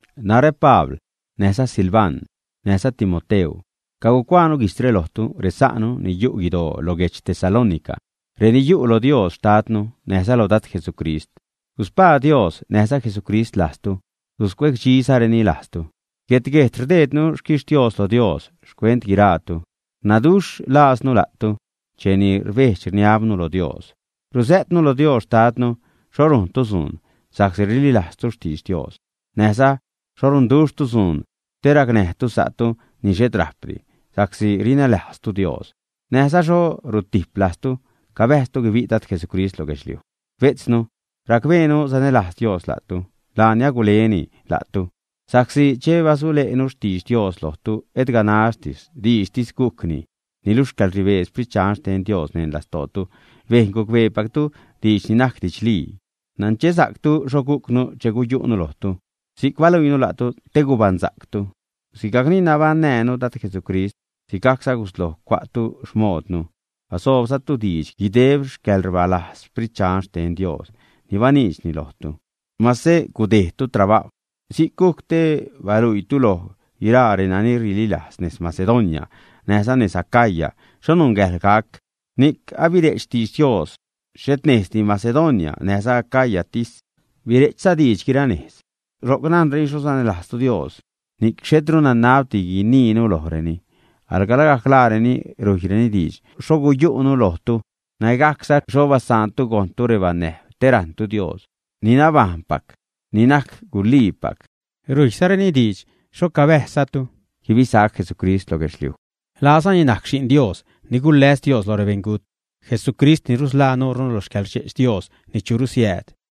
Narä, Pabl, näjza Silvan, näjza Timoteu cacuaanu guijtzre lojtu, resa'nu ni yu' guidoo lo guedx Tesalónica, reni yu' lo Dios Xtadnu näjza lo Dad Jesucrist. Guspaa Dios näjza Jesucrist lajztu, guscuecdxizareni lajztu. Guet-guejt rdeednu xquixtios lo Dios xcuent guiraatu, rnaduxhza laaznu la'tu cheni rbejdx rniabnu lo Dios. Ruzä'tnu lo Dios xtadnu xho rujntu dzuun sa'csi rililajztu xtidx Dios; näjza xho runduxhtu dzuun te racnäjtu sa'tu ni xhet rajpdi sa'csi rinälajztu Dios; näjza xho rutip lajztu cabäjztu guibi' Dad Jesucrist lo guedxliuj. Bejtznu, racbeenu sanälajz Dios la'tu, laani aguleni la'tu. Sa'csi che basule'nu xtidx Dios lojtu, et ganax diidxtis gujcni, niluxh xcäḻrnibee Sprit Dxan xten Dios neṉ lastootu bejn gucbeepactu diidx ni najc didxlii. Nanchesa'ctu xho gujcnu che guyu'nu lojtu. Si'c baluiinu la'tu te guibaṉsa'ctu. Sigajcni nabaṉnäjnu Dad Jesucrist sigajcza gusloj cua'tu xmoodnu, basoobzatu diidx guideb xcäḻrbalajz Sprit Dxan xten Dios ni baniidxni lojtu, mase gudejdtu trabajw. Si'c gujc te baluiitu loj guiraa reni rililajz nez Macedonia näjza nez Acaya xho nungäjḻ gac. Ni'c abire'ch xtidx Dios, xhet nejzdi Macedonia näjza Acayatis, bire'chza diidx guira nejz. Ro'c najnreni xho sanälajztu Dios, ni'c xhetru nanabti guiniinu lojreni. Alga lagajc laareni rujyreni diidx xho guyu'nu lojtu; nägajcza xho basaantu gojṉtu rebanäjb te rajṉtu Dios ni nabajṉpac ni najc guliipac. Rujyzareni diidx xho cabäjzzatu guibisac Jesucrist lo guedxliuj. Laazani najc Xi'n Dios ni guläs Dios lo rebeṉgut, Jesucrist ni rusḻaa nuurnu lo xcäḻrdxe'ch Dios ni churu siääd.